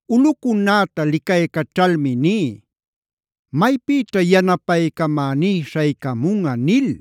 Ulꞌucunäta licaycaćhalmi ní: “¿Maypïćha yanapaycamäní śhaycamunꞌa?” nil.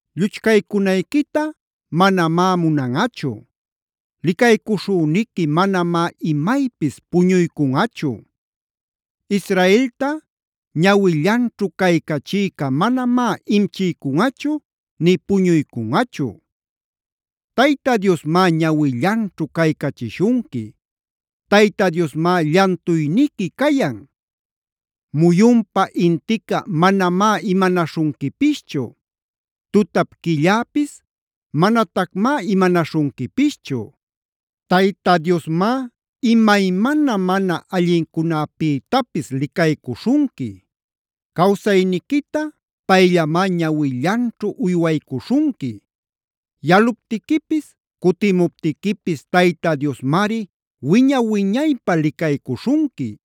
Lluchcaycunayquita manamá munanꞌachu. Licaycuśhüniqui manamá imaypis puñuycunꞌachu. Israelta ñawillanćhu caycachïca manamá imchiycunꞌachu nï puñuycunꞌachu. Tayta Diosmá ñawillanćhu caycachishunqui. Tayta Diosmá llantuyniqui cayan. Muyunpa intica manamá imanaśhunquipischu. Tutap quilläpis manatacmá imanaśhunquipischu. Tayta Diosmá imaymana mana allincunapïtapis licaycuśhunqui. Cawsayniquita payllamá ñawillanćhu uywaycuśhunqui. Yaluptiquipis, cutimuptiquipis Tayta Diosmari wiña-wiñaypä licaycuśhunqui.